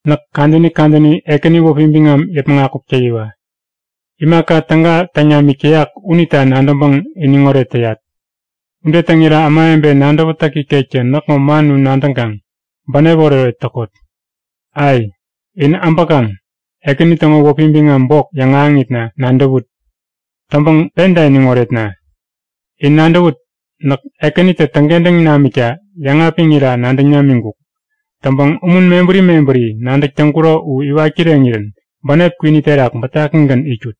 Näk kadäni kadäni Ekäni wäpi biŋam yäpmäŋ akuk täyiwa! Imaka täga täŋ namik täyak unita nadäŋpäŋ iniŋoret täyat. Ude täŋira ämawebe nadäwätäk ikektä näkŋo man u nadäŋkaŋ bänep oretoret täkot. Ai! In äbäkaŋ Ekäni täŋo wäpi biŋam bok yäŋahäŋitna nadäwut! Täŋpäŋ penta iniŋ oretna! In nadäwut! Näk Ekänitä täŋkentäŋ namikta yäŋapiŋira nadäŋ namiŋkuk. Täŋpäŋ umun mebäri mebäri nadäk täŋkuro u iwat kireŋirän bänep kwini terak bätakigän itkut.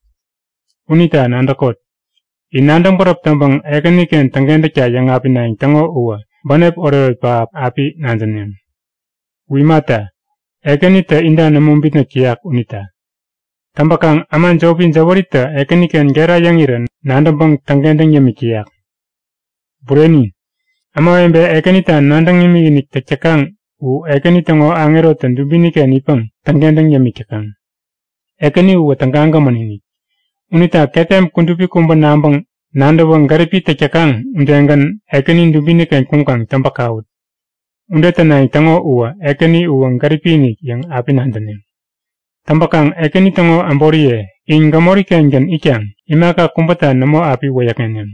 Unita nadäkot; In nadäŋ bäräp täŋpäŋ Ekäniken täŋkentäkta yäŋapinayäŋ täŋo uwä bänep oretoret pähap api nadäneŋ. U imata, Ekänitä inta nämo bitnäk täyak unita. Täŋpäkaŋ äma jopi jäwäritä Ekäniken gera yäŋirä nadäŋpäŋ täŋkentäŋ yämik täyak. Bureni! Ämawebe Ekänita nadäŋ imikinik täk täkaŋ u Ekäni täŋo aŋerotä dubiniken itpäŋ täŋkentäŋ yämik täkaŋ. Ekäni uwä tägagämän-inik. Unita ketem kudupi kubä nabäŋ nadäwä gäripi täk täkaŋ udegän Ekäni dubiniken kuŋkaŋ täŋpäŋ-kawut. Ude tänayäŋ täŋo uwä Ekäni uwä gäripi-inik yäŋ api nadäneŋ! Täŋpäkaŋ Ekäni täŋo äboriye, in gämori-kengän itkaŋ imaka kubäta nämo api wäyäkŋeneŋ.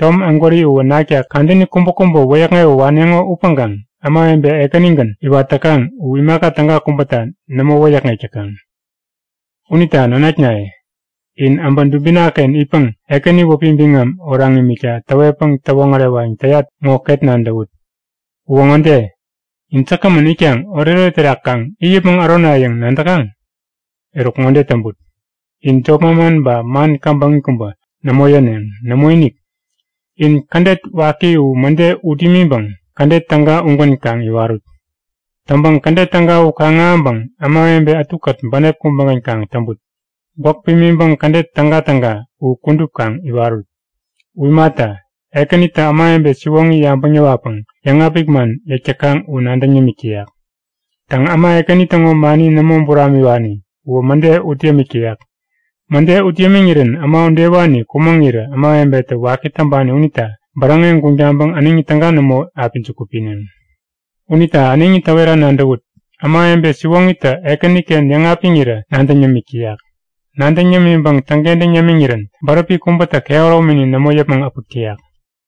Tom ägwäri uwä nakta kadäni kubäkubä wäyäkŋewä waneŋo upäŋkaŋ ämawebe Ekänigän iwat täkaŋ u imaka täga kubäta nämo wäyäkŋek täkaŋ. Unita nanaknaye, in äbä dubinaken itpäŋ Ekäni wäpi biŋam oraŋ imikta täwetpäŋ täwoŋärewayäŋ täyat ŋo ket nadäwut. Uwä ŋode; In säkgämän itkaŋ oretoret terak kaŋ it yäpmäŋ ärona yäŋ nadäkaŋ? Eruk ŋode täŋput! In jop manman ba man käbäŋi kubä nämo yäneŋ. Nämoinik! In kädet waki u mäde ut imiŋpäŋ kädet täga ugän kaŋ iwarut. Täŋpäŋ kädet täga u kaŋ-ahäŋpäŋ ämawebe ätukät bänep kubägän kaŋ täŋput. Gwäk pimiŋpäŋ kädet tägatäga u kudup kaŋ iwarut. U imata, Ekänitä ämawebe siwoŋi yabäŋ yäwatpäŋ yäŋapik man yäk täkaŋ u nadäŋ yämik täyak. Täŋ äma Ekäni täŋo mani nämo buramiwani uwä mäde ut yämik täyak. Mäde ut yämiŋirän äma udewani kumäŋirä ämawebetä waki täŋpani unita bäräŋeŋ guŋ taŋpäŋ äneŋi täga nämo api juku pineŋ. Unita äneŋi täwera nadäwut; Ämawebe siwoŋitä Ekäniken yäŋapiŋirä nadäŋ yämik täyak. Nadäŋ yämiŋpäŋ täŋkentäŋ yämiŋirän bäräpi kubätä kehäromini nämo yäpmäŋ äpäk täyak.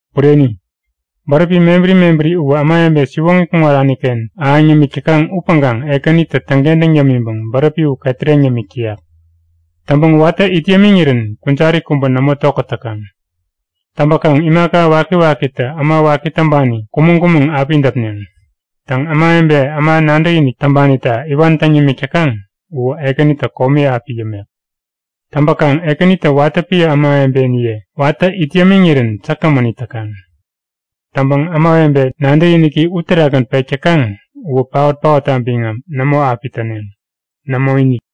Bureni, bäräpi mebäri mebäri uwä ämawebe siwoŋi kuŋaraniken ahäŋ yämik täkaŋ upäŋkaŋ Ekänitä täŋkentäŋ yämiŋpäŋ bäräpi u ketäreŋ yämik täyak. Täŋpäŋ watä it yämiŋirän kujari kubä nämo tokät täkaŋ. Täŋpäkaŋ imaka wakiwakitä äma waki täŋpani kumäŋ-kumäŋ api däpneŋ. Täŋ ämawebe, äma nadäkinik täŋpanita iwan täŋ yämik täkaŋ uwä Ekänitä komi api yämek. Täŋpäkaŋ Ekänitä watä piä ämawebeniye watä it yämiŋirän säkgämän it täkaŋ. Täŋpäŋ ämawebe nadäkiniki u terakgän pek täkaŋ uwä paot-paotta biŋam nämo api täneŋ. Nämoinik.